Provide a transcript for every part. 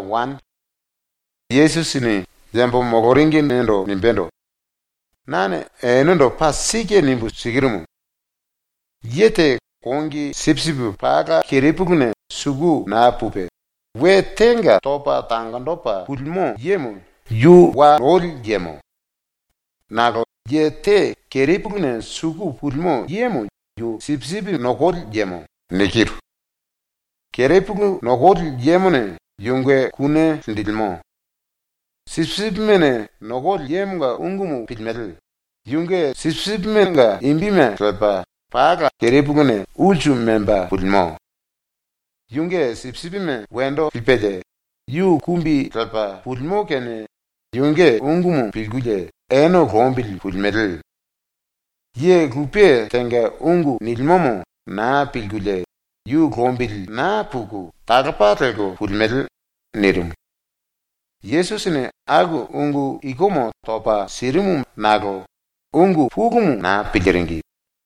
Walse Yesusini yambo moloringimendo nimbendo: “Nane enendo paa sike nimbu sikirumu: Ye te kongi sipisipi pala kerepuluna suku naa pupe, we tenga topa tangonjipe pulimo yemo yu wa noli yemo. Nakolo ye te kerepuluna suku pulimo yemo yu sipisipi nokoli yemo. Kerepulu nokoli yemone yunge kune linjilimo. Sipisipimene nokoli yemonga ungumu pilimele, yunge sipisipimenga imbime lepa pala kerepuluna ulsu memba pulimo. Yunge sipisipime wendo lipelie, yu kumbi lepa pulimo kinie yunge ungumu pilkulie ene lombili pulimele. Ye lupe tenga ungu nilimomo naa pilkulie yu lombili naa puku talopa lelko pulimele.” nirimu. Yesusini aku ungu ikumu topa sirimu nakolo ungu pulumu naa piliringi.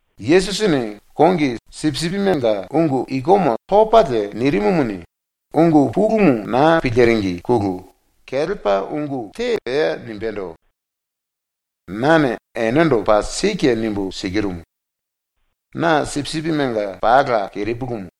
Yesusini ⸤kongi sipisipimenga ungu ikumu topalie nirimumuni, ungu pulumu naa piliringine⸥ kelepa ungu te pea nimbendo: “Nane enendo paa sike nimbu sikirumu: Na sipisipimenga pala kerepulumu.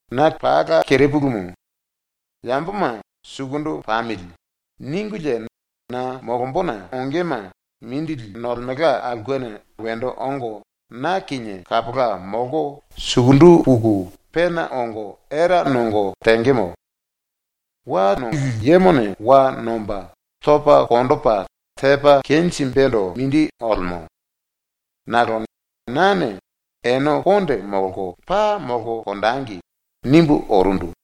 Na kerepulumu. Yamboma ‘Sukundu pamili.’ ningulie na molombona ongema mindili nolemelka aulkena wendo ongo na kinie kapola molko sukundu puku pena ongo era nongo tengemo. Wa lili yemo wa nomba topa konjipe tepa kenjimbendo mindi olemo. Nakolo nane ‘Ene konde molko paa molko konjengi.’ nimbu orundu.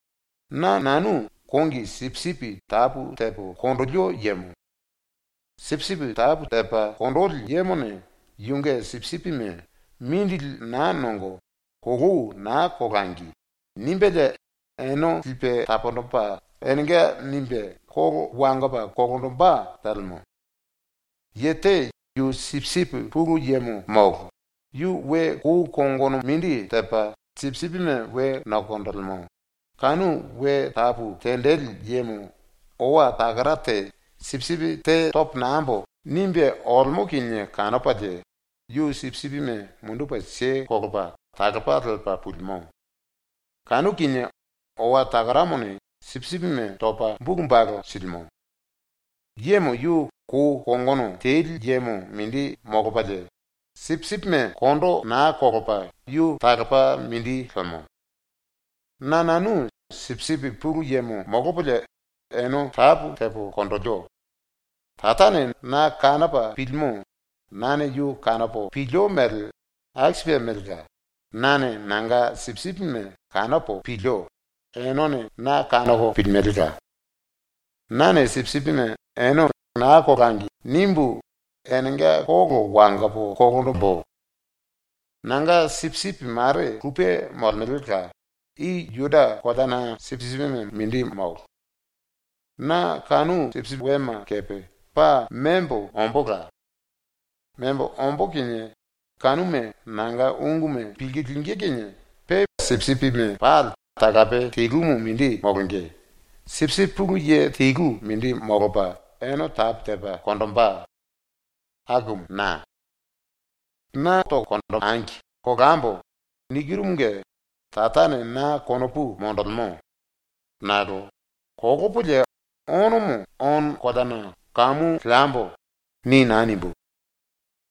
“Na nanu kongi sipisipi tapu tepo konjilio yemo. Sipisipi tapu tepa konjili yemone yunge sipisipime ‘Mindili naa nongo, kolou naa kolangi.’ nimbelie ene lipe taponjipe enenga nimbe kolo wangopa kolonjimbe telemo. Ye te yu sipisipi pulu yemo molo, yu we kou kongono mindi tepa sipisipime we nokonjilimo, kanu we tapu tenjili yemo owa takara te ‘Sipisipi te topo nambo.’ nimbe olemo kinie kanopalie, yu sipisipime mundupe kelepa talopa lepa pulimo. Kanu kinie owa takaramone sipisipime topa bulu balu silimo. Yemo yu kou kongono teli yemo mindi molopalie, sipisipime kondo naa kolopa yu talopa mindi lemo. “Na nanu sipisipi pulu yemo molopolie ene tapu tepo konjilio. Tarane na kanopa pilimo nane yu kanopo pilio mele aku sipe melela, nane nanga sipisipime kanopo pilio enene na kanoko pilimelela. Nane sipisipime ene ‘Naa kolangi.’ nimbu enenga kolo wangopo kolonjimbu. Nanga sipisipi mare lupe molemelela, i ⸤Juda⸥ koleana sipisipime molo. Na kanu sipisipi wema kepe membo ombóla. Membo ombó kinie kanuma nanga unguma pilku lingí kinie pe sipisipime pali talape telumu mindi molonge, sipisipi pulu ye telu mindi molopa ene tapu tepa konjimbe. Akumu na. “‘Na kolambo.’ nikirumunge Tarane na konopu monjilimo. Nakolo ‘ ‘Kolopolie onomo ono koleana kamu leambo.’ ni naa nimbu,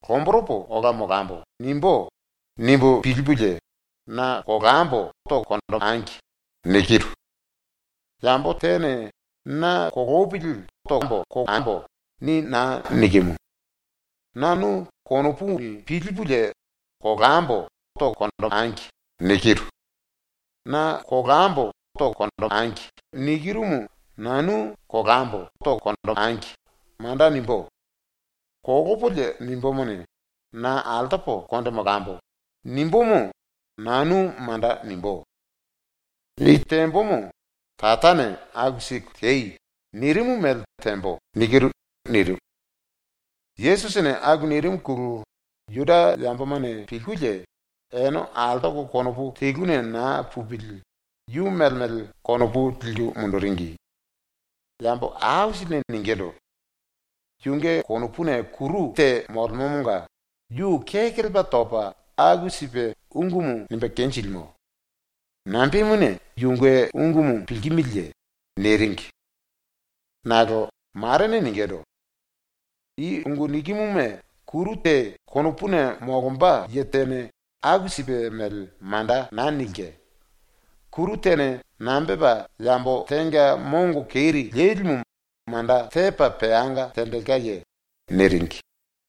‘Lomboropo ola molambo.’ nimbú.’ nimbu pilipulie ‘Na kolambo.’ nikiru. Yambo tene na ‘Kolopili tambo.’ ni naa nikimu; nanu konopuni pilipulie ‘Kolambo.’ nikiru. ‘Na kolambo tangi.’ nikirumu nanu ‘Kolambo.’ manda nimbú. Kolopolie nimbumuni, ‘Na altopo konde molambo.’ nimbumu nanu manda nimbú. I tembomo Tarane “Aku siku tei.” nirimu mele tembo.” nirimu. Yesusini aku nirimuna Juda yambomane pilkulie ene altoko konopu teluna naa pupili yu mele mele konopu liku munduringi. Yambo aisilini ningindu: “Yunge konopuna kuru keri te molemomonga yu kekelepa topa aku sipe ungumu nimbe kenjilimo. Nambemuna yunge ungumu pilkimiliye?” niringi. Nakolo marene ningindu: “I ungu nikimuma kuru te konopuna molomba ye tene aku sipe mele manda naa nilke. Kuru tene nambe tepa yambo tenga mongo keri lelimu manda tepa peanga tenjilkeye?” niringi.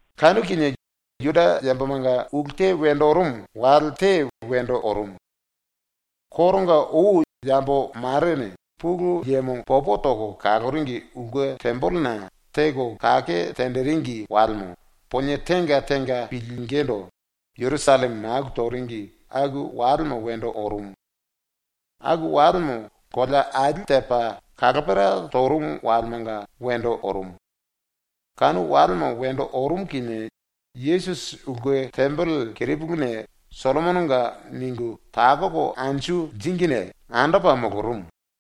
Kanu kinie Juda yambomanga ulu te wendo orumu wale te wendo orumu. Koronga ou yambo marene Pulu Yemo popo toko kaloringi ulke tembelena teko kake tenjiringi walemo ponie tenga tenga pilingindu Jerusalleme maku toringi aku walemo wendo orumu. Aku walemo kolea ali tepa kalopera torumu walemanga wendo orumu. Kanu walemo wendo orumu kinie Yesusi ulke tembele kerepuluna ‘Sollomononga’ ningu takoko anju liringine andopa molorumu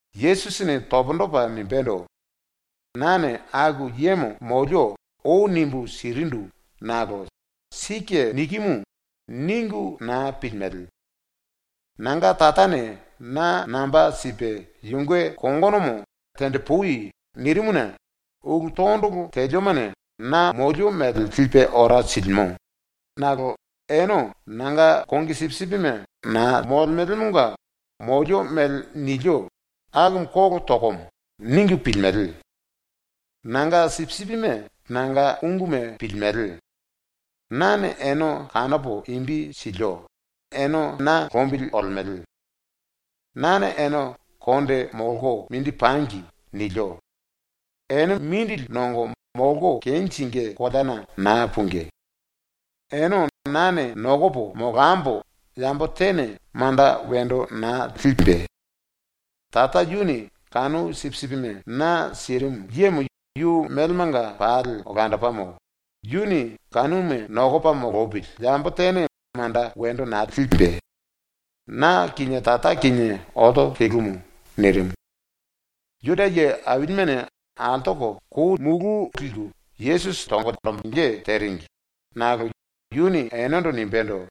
Yesusini pundu topa nimbendo: “Nane aku yemo molio ou nimbu sirindu nakolo ‘Sike nikimu.’ ningu naa pilimele. Nanga Tarane na namba sipe yunge kongonomo “tenjipui.” nirimuna ulu tondolo teliomane na molio mele lipe ora silimo, nakolo ene nanga kongi sipisipime naa molemelemonga molio mele nilio akumu ‘Kolo tokomo.’ ningu pilimele. Nanga sipisipime nanga unguma pilimele. Nane ene kanopo imbi silio, ene na lombili olemele. Nane ene ‘konde molko mindi pangi.’ nilio. Ene mindili nongo molko kenjingí koleana naa pungí. Ene nane nokopo molambo yambo tene manda wendo naa limbe. Tara yuni kanu sipisipime na sirimu yemo yu melemanga pali olandopamo, yuni kanuma nokopa molopili yambo tene manda wendo naa limbe. Na kinie Tara kinie olto telumu.” nirimu. Juda ye ailimene altoko kou liku Yesusi tonge teringi, nakolo yuni enendo nimbendo: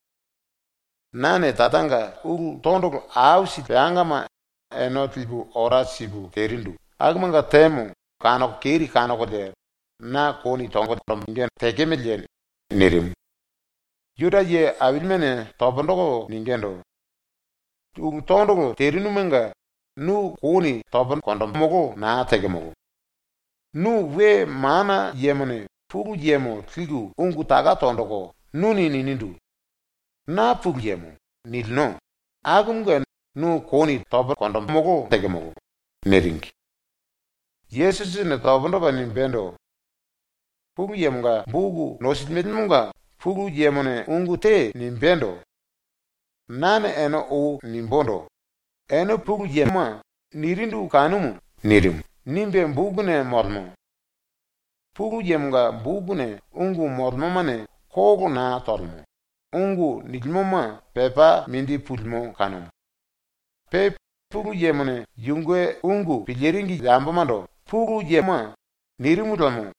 “Nane Taranga ulu tondolo aisili peangama ene lipu ora sipu terindu, akumanga temo kanoko keri kanokolie na kouni tonge tekemeleye?” nirimu. Juda ye ailimene pundu toko ningindu: “Ulu tondolo terinumanga nu kouni tomolo naa tekemolo. Nu we mana yemone Pulu Yemo liku ungu taka tonjiku nuni ninindu: “Na Pulu Yemo.” nilino, akumunge nu kouni tomolo tekemolo.” niringi. Yesusini pundu topa nimbendo: “Pulu Yemonga boku nosilimelemonga Pulu Yemone ungu te nimbendo: “Nane ene ou nimbundu: ‘Ene pulu yema.’ nirindu kanumu.” nirimu, nimbe bokuna molemo. Pulu Yemonga bokuna ungu molemomane kolo naa tolemo, ungu nilimoma pepa mindi pulimo kanumu. Pe Pulu Yemone yunge ungu piliringi yambomando “pulu yema.” nirimu liemo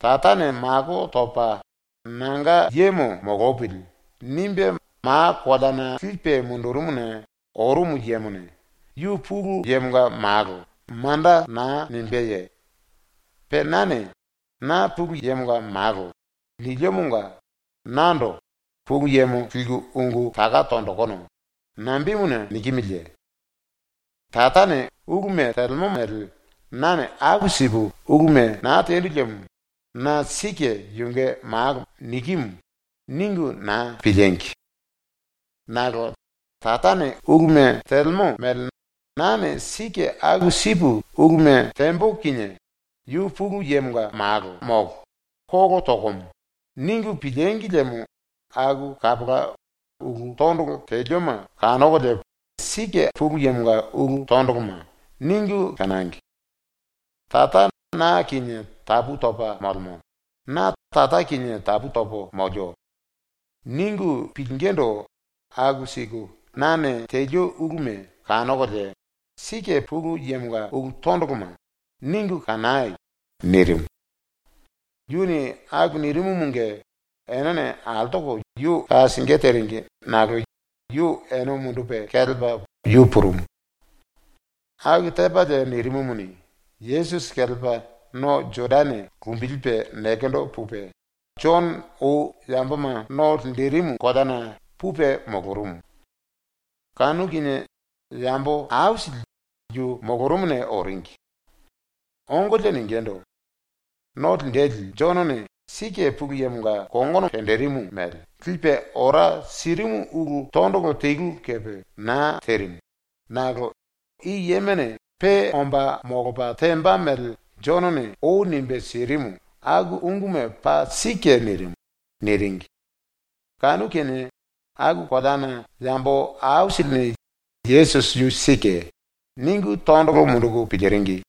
Tarane mako topa ‘nanga yemo molopili.’ nimbe ma koleana lipe mundurumuna orumu yemone “yu Pulu Yemonga Malo.” manda naa nimbeye? Pe nane “Na Pulu Yemonga Malo.” niliomonga nando “Pulu Yemo liku ungu taka tonjikinu.” nambemuna nikimiliye? Tarane uluma telemo mele nane aku sipu uluma naa tendu liemo na ‘sike yunge malo nikimu’ ningu naa piliengi! Nakolo Tarane uluma telemo mele nane sike aku sipu uluma tembo kinie ‘Yu Pulu Yemonga Malo molo. Kolo tokomo.’ ningu pilíngi liemo aku kapola ulu tondolo telioma kanokolie ‘Pulu Yemonga ulu tondoloma.’ ningu kanangi. ‘Tara na kinie tapu topa molemo, na Tara kinie tapu topo molio.’ ningu pilingindu aku siku nane telio uluma kanokolie ‘Pulu Yemonga ulu tondoloma.’ ningu kanai.” nirimu. Yuni aku nirimumunge enene altoko yu ka singí teringi nakolo yu ene mundupe kelepa yu purumu. Aku tepalie nirimumuni, Yesusi kelepa no Jodane lumbilipe nekendo pupe, Jono ou yamboma no linjirimu koleana pupe molorumu. Kanu kinie yambo aisili yu molorumuna oringi. Ongolie ningindu: “⸤No Linjili⸥ Jonone sike ⸤Pulu Yemonga kongono tenjirimu mele⸥ lipe ora sirimu ulu tondolo telu kepe naa terimu, nakolo i yemone pe omba molopa temba mele Jonone ou nimbe sirimu aku unguma paa sike nirimu.” niringi. Kanu kinie aku koleana yambo aisilini ‘Yesusi yu sike.’ ningu tondolo munduku piliringi.